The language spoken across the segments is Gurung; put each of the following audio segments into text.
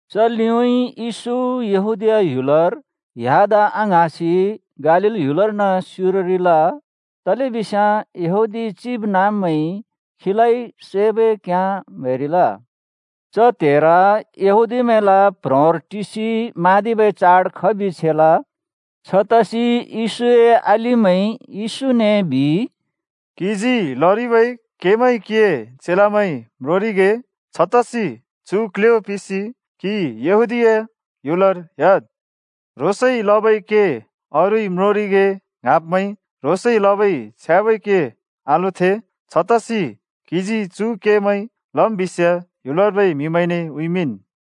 च लिउँइँ येशू यहूदीया ह्‍युलर ह्‍यादा आङ्हाँसि गालील ह्‍युलर्न स्युररिल। तलेबिस्याँ यहूदी चिबनाँब्मैंइ खीलाइ सैबै घ्याँ म्हैरिल। च त्‍हेर यहूदीमैंला प्ह्रोंर टिसि म्हाँदिबै चाड खबि छेल। छतसि येशूए अलिमैंइ येशूने बिइ, “क्‍हिजी लरिबै केमैं क्‍हिए चेलामैंइ म्रोंरिगे। छतसि चु क्‍ल्‍ह्‍यो पिसि क्हि यहूदीया ह्‍युलर ह्‍याद्। ह्रोंसइ लबै के अरूइ म्रोंरिगे ङ्हाँब्मैंइ ह्रोंसइ लबै छ्याँबै के आलोथें। छतसि क्‍हिजी चु केमैं लम् बिस्याँ ह्‍युलर्बै म्हिमैंने उँइँमिंन्।”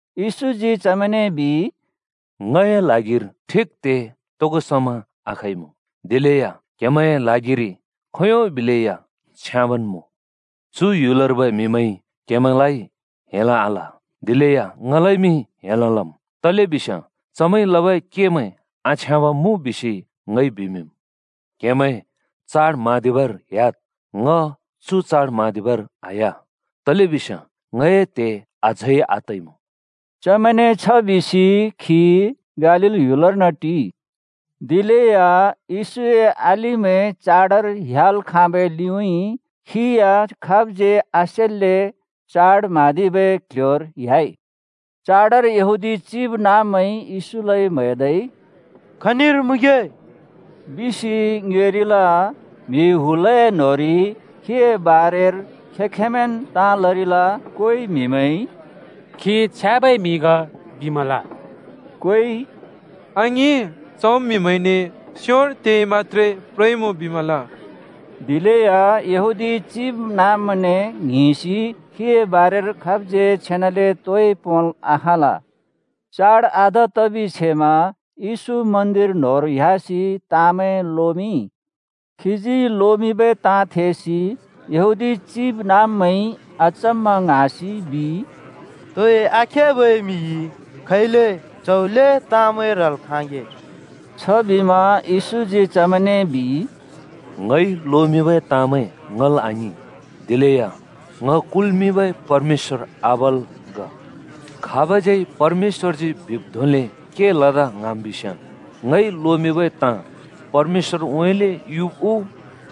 येशूजी चमैंने बिइ, “ङए ल्हागिर ठिक त्हे तोगो समा आखइमुँ, दिलेया क्हेमैंए ल्हागिरि खोंयों बिलै या छ्याँबन् मुँ। चु ह्‍युलर्बै म्हिमैंइ क्‍हेमैंलाइ हेल् आल, दिलेया ङलाइमि हेल् लम्, तलेबिस्याँ चमैंइ लबै केमैं आछ्याँब मुँ बिसि ङइ बिमिंम्। क्‍हेमैं चाड म्हाँदिबर ह्‍याद्। ङ चु चाड म्हाँदिबर आह्‍या, तलेबिस्याँ ङए त्हे अझै आतइमुँ।” चमैंने छ बिसि खी गालील ह्‍युलर्न टिइ। दिलेया येशूए अलिमैं चाडर ह्‍याल् खाँबै लिउँइँ खी या खाबज्यै आसेल्‍ले चाड म्हाँदिबै क्ल्ह्‍योर ह्‍याइ। चाडर यहूदी चिबनाँब्मैंइ येशूलाइ म्हैदै “खनिर मुँगे?” बिसि ङ्योएरिल। म्हि हुलए न्होंरि खीए बारेर खें-खेंमैंन् ताँ लरिल। कोइ म्हिमैंइ “खी छ्याँबै म्हि ग बिमल,” कोइ “आङिं, चम् म्हिमैंने स्योर तेइ मत्‍त्रे प्रइमुँ बिमल।” दिलेया यहूदी चिबनाँब्मैंने ङ्हिंसि खीए बारेर खाबज्‍यै छेनाले तोइ पोंल् आखाँल। चाड आधा तबि छेमा येशू मन्दिर न्होंर ह्‍यासि ताँमैं लोमिंइ। खीजी लोमिंबै ताँ थेसि यहूदी चिबनाँब्मैंइ अचम्‍मा ङ्हाँसि बिइ, “तोइ आखेबै म्हिइ खैले च्हौ ल्हें ताँमैं ह्रल् खाँगे?” छबिमा येशूजी चमैंने बिइ, “ङइ लोमिंबै ताँमैं ङल् आङिं, दिलेया ङ कुल्‍मिंबै परमेश्‍वर आबाला ग। खाबज्यै परमेश्‍वरजी बिब् धोंले के लदा ङ्हाँम् बिस्याँ, ‘ङइ लोमिंबै ताँ परमेश्‍वरउँइँले युब् उ,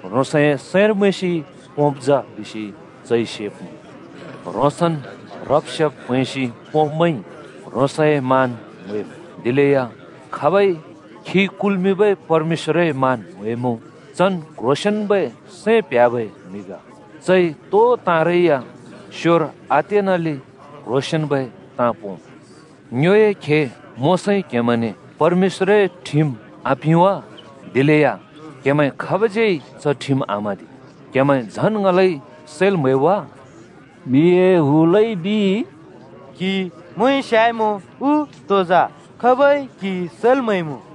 ह्रोंसए सैंर मैंसि पोंब् जा’ बिसि चइ सेब्मुँ। ह्रोंसन् ह्रब् सेब् प्हैंसि पोंब्मैंइ ह्रोंसए मान म्हैम्, दिलेया खाबइ खी कुल्मिंबै परमेश्‍‍वरए मान म्हैमुँ, चन् क्ह्रोंसेंन्बै सैं प्ह्‍याबै म्हि ग। चइ तो ताँरै या स्योर आतेनाले क्ह्रोंसेंन्बै ताँ पोंम्। ङ्योए खे मोशाइ क्‍हेमैंने परमेश्‍वरए ठिम पिंइ, आपिं वा? दिलेया क्‍हेमैं खाबज्‍यै च ठिम आम्हाँदि। क्हेमैं झन् ङलाइ सैल् म्‍हैब् वा?” म्हिए हुलइ बिइ, “क्‍हि मोंइ स्‍याइमुँ उ तो जा? खाबइ क्‍हि सैल् म्हैमु?”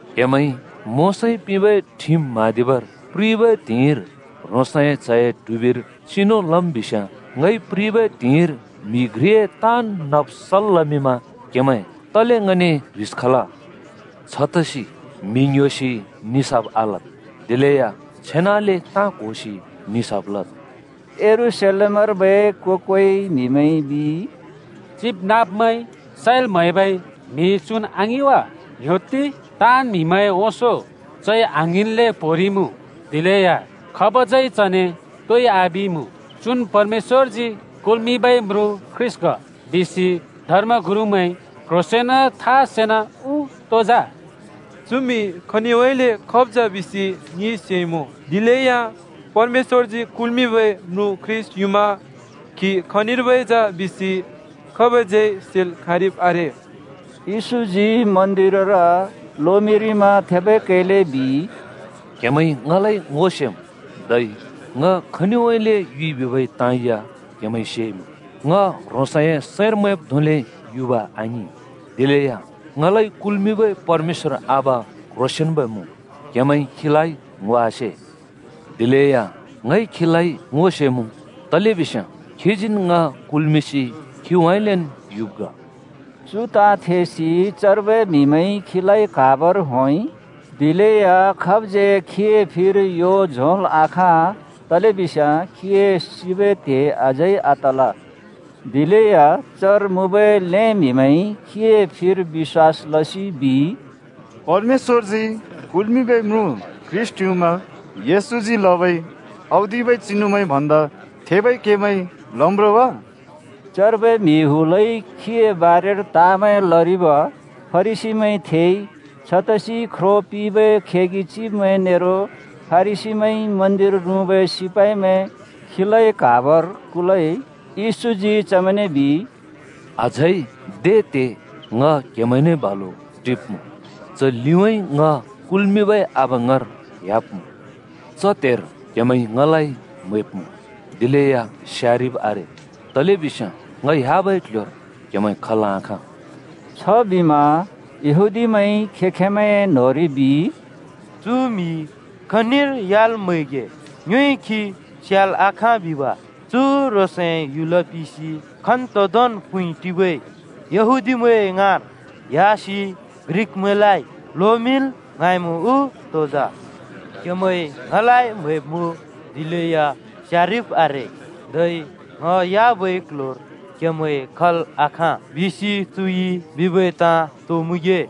क्हेमैंइ मोशाइ पिंबै ठिम म्हाँदिबर प्रिबै त्हिंइर ह्रोंसए च्हए ट्हुबिर चिनु लम् बिस्याँ, ङइ प्रिबै त्हिंइर म्हि घ्रिए ताँन् नब् सल् लमिंमा क्हेमैं तले ङने ह्रिस खल? छतसि म्हि ङ्‍ह्‍योसि निसाफ आलद्, दिलेया छेनाले ताँ क्होसि निसाफ लद्।” यरूशलेमर्बै को-कोइ म्हिमैंइ बिइ, “चिबनाँब्मैंइ सैल् म्‍हैबै म्हि चुन् आङिं वा? ङ्‌ह्‍योत्ति! ताँन् म्हिमैंए ओंसों चइ आङ्हिंन्ले पोंरिइमुँ, दिलेया खाबज्यै चने तोइ आबिइमुँ! चुन् परमेश्‍वरजी कुल्मिंबै म्रुँ ख्रीष्‍ट ग बिसि धर्म-गुरुमैंइ क्‍ह्रोंसेंन था सेना उ तो जा? चु म्हि खनिउँइँले खब् जा बिसि ङिइ सेइमुँ। दिलेया परमेश्‍वरजी कुल्मिंबै म्रुँ ख्रीष्‍ट युमा खी खनिर्बै जा बिसि खाबज्यै सेल् खाँरिब् आरे।” येशूजी मन्दिरर लोमिंरिमा थेबै कैले बिइ, “क्हेमैंइ ङलाइ ङो सेम्, धै ङ खनिउँइँले युइ बिबै ताँ या क्हेमैंइ सेइमुँ। ङ ह्रोंसए सैंर मैंब् धोंले युब आङिं, दिलेया ङलाइ कुल्मिंबै परमेश्‍वर आबा क्ह्रोंसेंन्बै मुँ। क्हेमैंइ खीलाइ ङो आसे। दिलेया ङइ खीलाइ ङो सेमुँ, तलेबिस्याँ खीजीन् ङ कुल्मिंसि खीउँइँलेन् युब् ग।” चु ताँ थेसि चर्बै म्हिमैंइ खीलाइ क्हाबर होंइ। दिलेया खाबज्यै खीए फिर यो झोंल् आखाँ। तलेबिस्याँ खीए सिबै त्हे अझै आतल। दिलेया चर मुँबै ल्‍हें म्हिमैंइ खीए फिर बिश्‍वास लसि बिइ, “परमेश्‍वरजी कुल्मिंबै म्रुँ ख्रीष्‍ट युमा येशूजी लबै औदिबै चिनुमैं भन्दा थेबै केमैं लम् रो वा?” चर्बै म्हि हुलइ खीए बारेर ताँमैं लरिब फरिसीमैंइ थेइ। छतसि ख्रो पिंबै खेगि चिब्मैं नेरो फरिसीमैंइ मन्दिर रुँबै सिपाइमैं खीलाइ क्हाबर कुलइ। येशूजी चमैंने बिइ, “अझै दे त्हे ङ क्‍हेमैंने बालु टिब्‍मुँ, च लिउँइँ ङ कुल्मिंबै आबा ङाँर ह्‍याब्‍मुँ। च त्‍हेर क्‍हेमैंइ ङलाइ म्‍हैब्‍मुँ, दिलेया स्यारिब् आरे। तलेबिस्याँ ङ ह्‍याबै क्‍ल्‍ह्‍योर क्‍हेमैं खल् आखाँ।” छबिमा यहूदीमैंइ खें-खेंमैंए न्होंरि बिइ, “चु म्हि खनिर ह्‍याल् म्हैगे? ङ्योइ खी स्याल् आखाँ बिब? चु ह्रोंसए ह्‍युल पिसि खन्तोंदोंन् प्हुँइ टिबै यहूदीमैं ङाँर ह्‍यासि ग्रिकमैंलाइ लोमिंल् ङ्हाँइँमुँ उ तो जा? ‘क्‍हेमैंइ ङलाइ म्‍हैब्‍मुँ, दिलेया स्यारिब् आरे’, धै ‘ङ ह्‍याबै क्‍ल्‍ह्‍योर क्‍हेमैं खल् आखाँ।’ बिसि चुइ बिबै ताँ तो मुँगे?”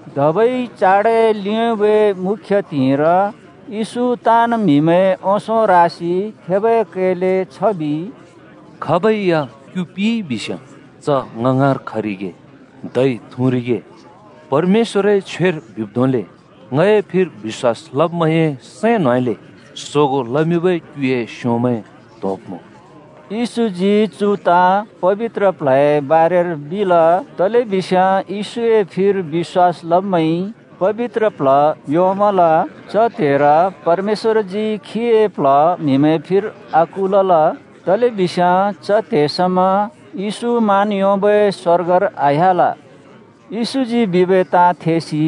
धबै चाडए लिउँबै मुख्य त्हिंइर, येशू ताँन् म्हिमैंए ओंसों रासि थेबै कैले छ बिइ, “खाबै या क्‍यु पिइ बिस्याँ च ङ ङाँर खरिगे धै थुँरिगे। परमेश्‍वरए छ्वेर बिब् धोंले ‘ङए फिर बिश्‍वास लब्मैंए सैं न्‍होंउँइँले सोगों लमिंबै क्‍युए स्योंमैं त्होंब्मुँ।’” येशूजी चु ताँ पबित्र प्ल्हए बारेर बिल। तलेबिस्याँ येशूए फिर बिश्‍वास लब्‍मैंइ पबित्र प्ल्ह योंमल। च त्‍हेर परमेश्‍वरजी खीए प्ल्ह म्हिमैं फिर आकुलल। तलेबिस्याँ च त्हे समा येशू मान योंबै स्‍वर्गर आह्‍याल। येशूजी बिबै ताँ थेसि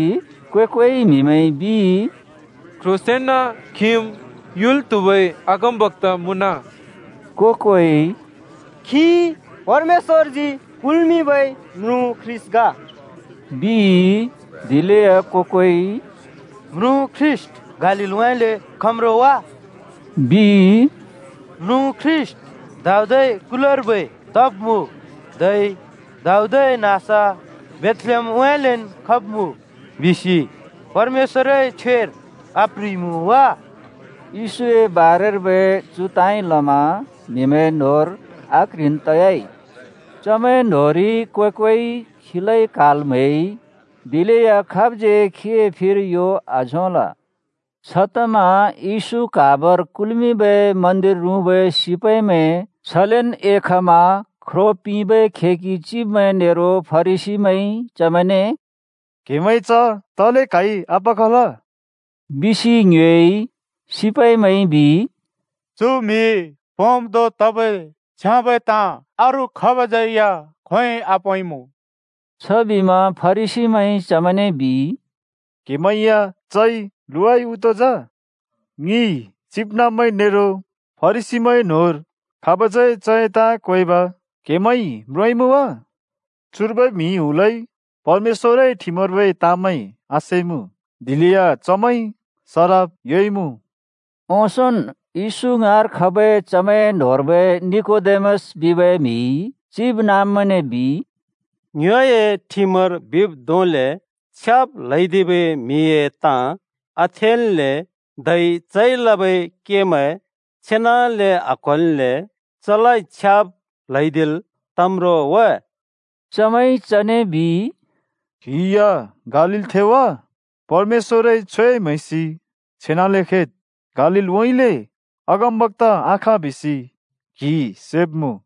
को-कोइ म्हिमैंइ बिइ, “क्‍ह्रोंसेंन खिम् युल् त्हुबै अगमबक्‍ता मुँन।” को-कोइ “खी परमेश्‍वरजी कुल्मिंबै म्रुँ ख्रीष्‍ट ग,” बिइ। दिलेया को-कोइ “म्रुँ ख्रीष्‍ट गालीललउँइँले खम् रो वा?” बिइ। “म्रुँ ख्रीष्‍ट दाऊदए कुलकर्बै तब्‍मुँ, धै दाऊद नाँस बेथलेहेमउँइँलेन् खब्मुँ। बिसि परमेश्‍वरए छ्वेर आप्ह्रिइमुँ वा?” येशूए बारेर्बै चु ताँइ लमा म्हिमैं न्‍होंर आक्ह्रिन् तयाइ। चमैं न्होंरि को-कोइ खीलाइ क्‍हाल् म्‍हैइ। दिलेया खाबज्यै खीए फिर यो आझोंल। छतमा येशू क्हाबर कुल्मिंबै मन्दिर रुँबै सिपाइमैं छलेन् एखमा ख्रो पिंबै खेगि चिब्मैं नेरो फरिसीमैंइ चमैंने “क्हेमैंइ च तले क्हाइ आपखल?” बिसि ङ्योएइ। सिपाइमैंइ बिइ, “चु म्हिइ पोंब् धों तबै छ्याँबै ताँ अरू खाबज्‍यै खोंयोंइ आपोंइँमुँ!” छबिमा फरिसीमैंइ चमैंने बिइ, “क्‍हेमैं या चइ लुवाइ उ तो जा? ङि चिबनाँब्मैं नेरो फरिसीमैंए न्होंर खाबज्‍यै चए ताँ क्वेंब क्‍हेमैंइ म्रोंइँमुँ वा? चुर्बै म्हि हुलइ परमेश्‍वरए ठिमर्बै ताँमैं आसेइमुँ, दिलेया चमैंइ सराप योंइँमुँ।” ओंसोंन् येशू ङाँर खबै चमैंए न्होंर्बै निकोदेमस बिबै म्हिइ चिबनाँब्मैंने बिइ, “ङ्योए ठिमर बिब् धोंले छ्याब् ल्हैदिबै म्हिए ताँ आथेल्‍ले, धै चइ लबै केमैं छेनाले आक्होल्‍ले चलाइ छ्याब् ल्हैदिल् तम् रो वा?” चमैंइ चने बिइ, “क्‍हि या गालीलथें वा? परमेश्‍वरए छ्वे म्हैसि छेनाले खेद्। गालीलउँइँले अगमबक्‍ता आख बिसि क्हिइ सेब्मुँ।”